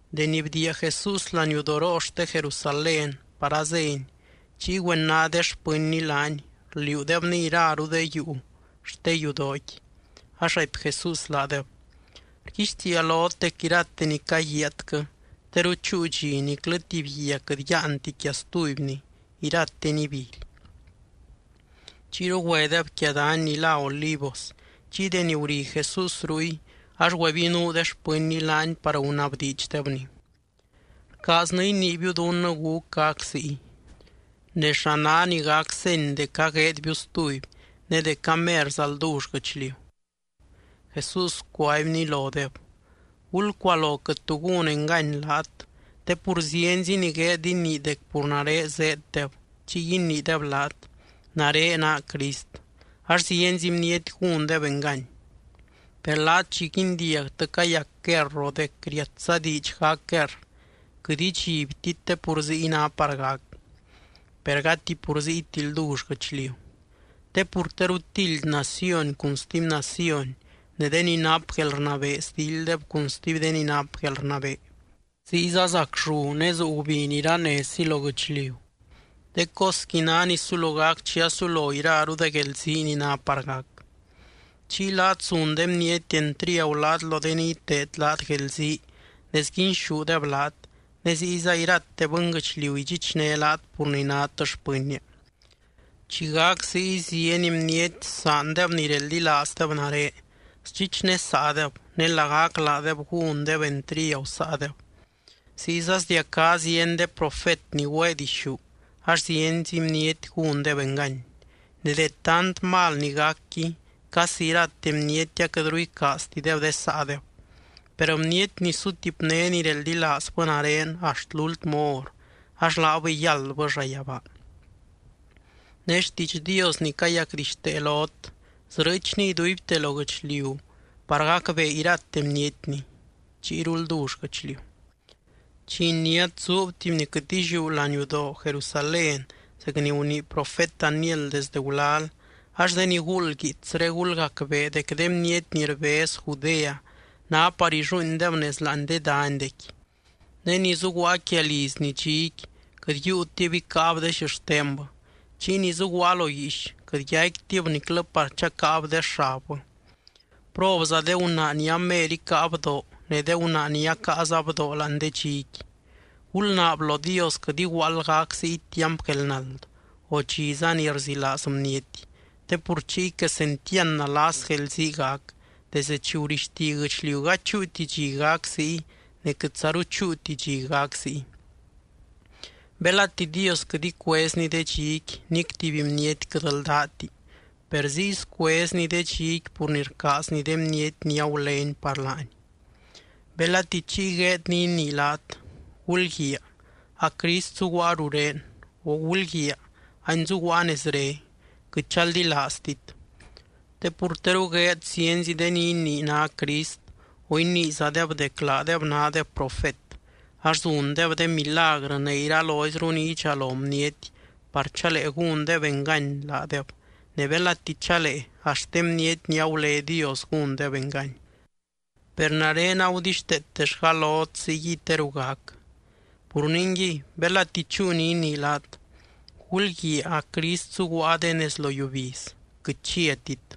Deni bdiia Jesús laniudoroo xte Jerusalén par azény, chiy güena de xpɨnny laany, rliuudebny iraru de yuu xte yudooqui. Ax raipy Jesús laadeb: —Rguixtiia lot dec irate ni caguiaatquɨ, teru chúu dxi niclɨ tuby guia quɨt yáanti quia stubyni, irateni ibily. Chiyru güedeb quia dany ni lá Olivos. Chiy deni guri Jesús ruy, ax güebinuu de xpɨnny laany par gunabdiidxdebny: —Rcaaznɨ iniibiu dunnɨ gúc gac ziy. Ne, ¿xa ná ni gac seny dec agueedbiu stuby, ne dec amerza ldull guɨchliu? Jesús cuaibny lodeb: —Gulcualo quɨt tu gún engany laat. Te pur zienzi ni gueed inii dec pur nare zéeddeb. Chiy iniideb laat: “Nare naa Crist”, ax zienzi bniety gúndeb engany. Per laat chi guindiagtɨ cayac guerr o dec riatza diidx gac guerr, quɨt idxibtit te pur ziy ná par gac. Per gati pur ziyti ldull guɨchliu. Te pur teru tildy naciony cun stuby naciony ne de ni nap guelrnabee sdilddeb cun stuby de ni nap guelrnabee. Ziyza zac llu ne zuu gubiny iranezzi lo guɨchliu. De cosqui ná ni sulo gac chi asulo iraru de guelzii ni ná par gac. ’Chiy laat zun de bniety entriagu laat lo de ni iteed laat guelzii ne sguinxúdeb laat, ne ziyza irate bɨnguɨchliu idxichné laat pur ni nát xpɨnnia. Chi gac ziy zieny bniety saandeb ni reldilaazdeb nare, sdxichnesaadeb ne lagac laadeb gúndeb entriagu saadeb. Ziyza sdiacá zieny de profet ni güee dixú, ax zienzi bniety gúndeb engany. Ne de tant de mal ni gacqui casi irate bniety aquɨtru icaaztideb de saadeb. Per bniety ni sutipné ni reldilaazbɨ nare axt lúltmɨ hor, ax laabɨy yáldbɨ llayabaa. Ne xtiidx Dios ni cayacdixtee lot, srɨɨchni iduibte lo guɨchliu par gacbee irate bnietni, chiyru ldull guɨchliu. ’Chi iniát zuub tuby ni quɨt illiú laniudoo Jerusalén zec ni gunii profet Daniel desde gulal (ax de ni guuld guiitsré, gulgacbee) dec de bniety ni rbez Judea ná par illuuindeb nez láani de danydequi. Ne ni zuguaa quia lizni dxiqui, quɨt yiiutib icáab de xixtenbɨ. Chiy ni zuguaa lo guiix quɨt yaicquitib niclɨ par chacáab de xabbɨ. ¡Probza de gunaa ni amer icáa bdoo ne de gunaa ni acaaza bdoo láani de dxiqui! Gulnaab lo Dios quɨt iguaald gac ziy tiamp guelnald, o dxiza ni rzilaaz bniety. Te pur chiy quesentiand nalas guelzii gac, desdɨ chi gurixti guɨchliu gady chúuti chi gac ziy ne quɨtzaru chúuti chi gac ziy. Belati Dios quɨt icuezny de dxiqui, nic tuby bniety quɨt ldáti. Per ziy scuezny de dxiqui pur ni rcaazny de bniety ni agulény par laany. ’Belati chiy gueed ni inii laat: “Gulguiaa, a Crist zuguaa rurén”, o “Gulguiaa, any zuguaa nezre”, quɨt chaldilaaztit. Te pur teru gueed zienzi de ni inii ná Crist o iniizadeb dec laadeb nádeb profet. Ax zundeb de milagrɨ ne iraloizru ni idxalo bniety par chalee gúndeb engany laadeb, ne belati chalee axt de bniety ni agulé Dios gúndeb engany. Per nare agudixteetellga lot ziyguiy teru gac. Pur ningui, belati chúu ni inii laat: “Gulguiaa, a Crist zuguaa de nez lo yiubiz”, quɨt chiatit.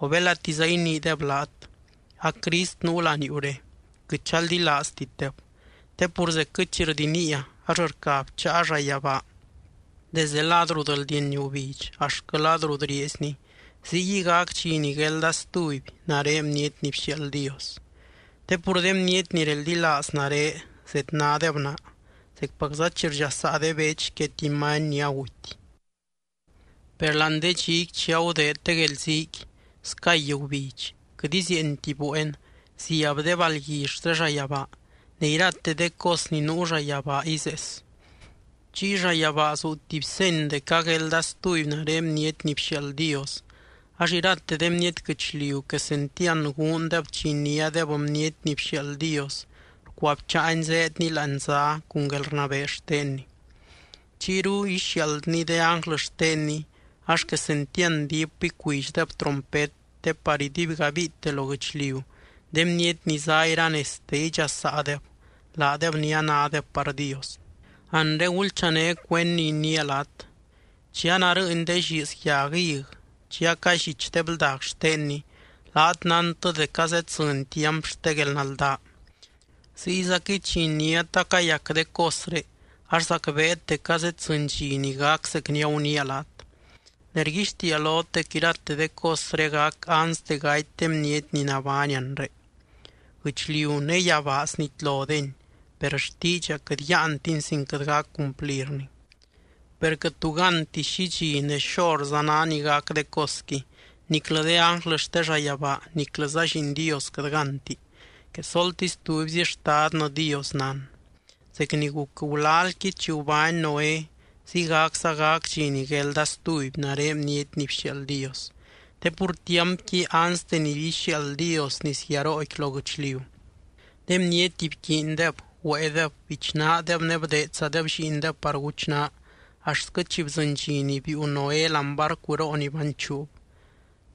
O belatiza iniideb laat: “A Crist nuu laniuure”, quɨt chaldilaaztitdeb. Te pur zecquɨ chi rdiniia ax rca bcháa llayabaa desde lad rut rldieny gubidx axtquɨ lad rut rieezni, ziyguiy gac dxi ni guelda stuby nare Bniety ni bxiaald Dios. Te pur de bniety ni reldilaaz nare zednádeb naa, zecpacza chi rdxasaa de bech quia tuby many ni aguty. ’Per láani de dxiqui chi agudeed de guelziiqui, scay gubidx, quɨt izieenti bueen, ziab de balgui xte llayabaa ne irate de cos ni nuu llayabaa izees. Chiy llayabaa zuu tuby seny dec aguelda stuby nare Bniety ni bxiaald Dios. Ax irate de bniety guɨchliu quesentiand guundeb chi iniádeb Bniety ni bxiaald Dios rcuabcháany zéedny láani zá cun guelrnabee xtenny. Chiyru ixiaaldny de ánglɨ xtenny, ax quesentiand diip icuidxdeb trompet te par iduibgabiite lo guɨchliu, de bniety ni zá iranezte, idxasaadeb, laadeb ni anádeb par Dios. ’Anre gulchané cuend ni iniia laat: Chi anarɨɨny de lliiz yag hig, chi acallich de bldag xtenni, laat nántɨ dec azeddzɨny tiamp xte guelnaldaa. Ziyzaquɨy chi iniát acayac de cosré ax zacbeet dec azeddzɨny dxi ni gac zec ni aguniia laat. Ne rguixtiia lot dec irate de cosré gac anste gaty de bniety ni nabány anre. Guɨchliu ne yabaa snitlodeni, per xtiidxa quɨt yáantin sin quɨt gac cumplirni. ’Per quɨt tu gánti xi dxi ne xorza ná ni gac de cosqui, niclɨ de ánglɨ xte llayabaa niclɨza Lliin Dios quɨt gánti. Quesoltisy tubyzi Xtadnɨ Dios nán. ’Zec ni guc gulalqui chi gubány Noé, ziygacza gac dxi ni guelda stuby nare Bniety ni bxiaald Dios. Te pur tiampqui anste ni ixiaald Dios nisguiarooqui lo guɨchliu, de bniety bquiindeb, güéedeb, bichnaadeb, ne bdeedzadeb lliindeb par guchnaa axtquɨ chi bdzɨny dxi ni biiu Noé láani barcuroo ni banchuub.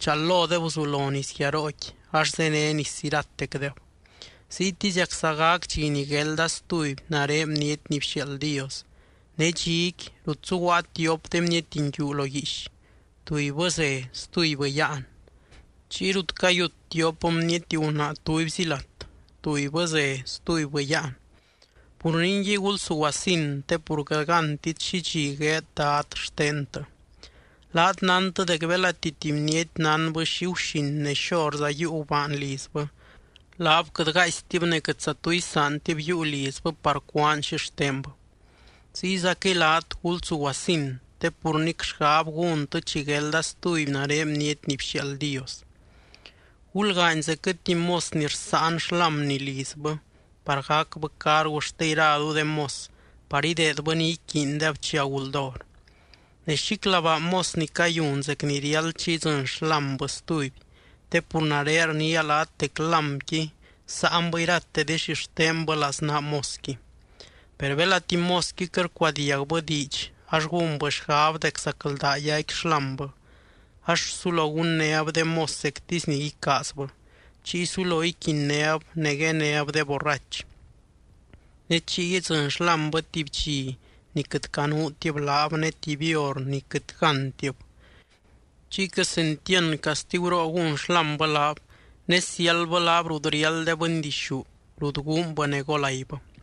Chal lodeb guzulo nisguiarooqui ax zéne nis iratecdeb. Ziytiziacza gac dxi ni guelda stuby nare Bniety ni bxiaald Dios. Ne dxiqui, rut zuguaa tiop de bniety nguiu lo guiix, tubybɨ ze, stubybɨ yáan. Chiy rut cayut tiop bniety gunaa tubyzi lat, tubybɨ ze, stubybɨ yáan. ’Pur ningui, gulsuguasin, te pur quɨt gántit xi dxi gueed Dad xtentɨ. Laat nántɨ dec belati tuby bniety nánbɨ xi guxin ne xorza yiiu gubaan lizbɨ, laab quɨt gaaistib ne quɨtza tu isaantib yiiu lizbɨ par cúaan xixtenbɨ. Ziyzaquɨy laat, gulsuguasin, te pur nic xgab gúntɨ chi guelda stuby nare Bniety ni bxiaald Dios. ’Gulgaany zecquɨ tuby mos ni rsáan xlámni lizbɨ par gacbɨ cargu xte iraru de mos par ideedbɨ ni iquiindeb chi aguld hor. Ne xíclabaa mos ni cayun zec ni riáld chi idzɨny xlámbɨ stuby, te pur nare rniia laat dec lámqui sáanbɨ irate de xixtenbɨ laznaa mosqui. Per belati mosqui quɨt rcuadiagbɨ diidx ax gúnbɨ xgab dec zacldaa yaicqui xlámbɨ, ax sulo gunnéb de mos zectisy ni icaazbɨ, chiy sulo iquinnéb ne guenéb de borrach. Ne chiy idzɨny xlámbɨ tuby dxi ni quɨt canuutib laab, ne tuby hor ni quɨt gántib. Chiy quesentiand castiguroo gún xlámbɨ laab, ne siáldbɨ laab rut riáld de bɨndixú, rut guunbɨ ne golaibɨ.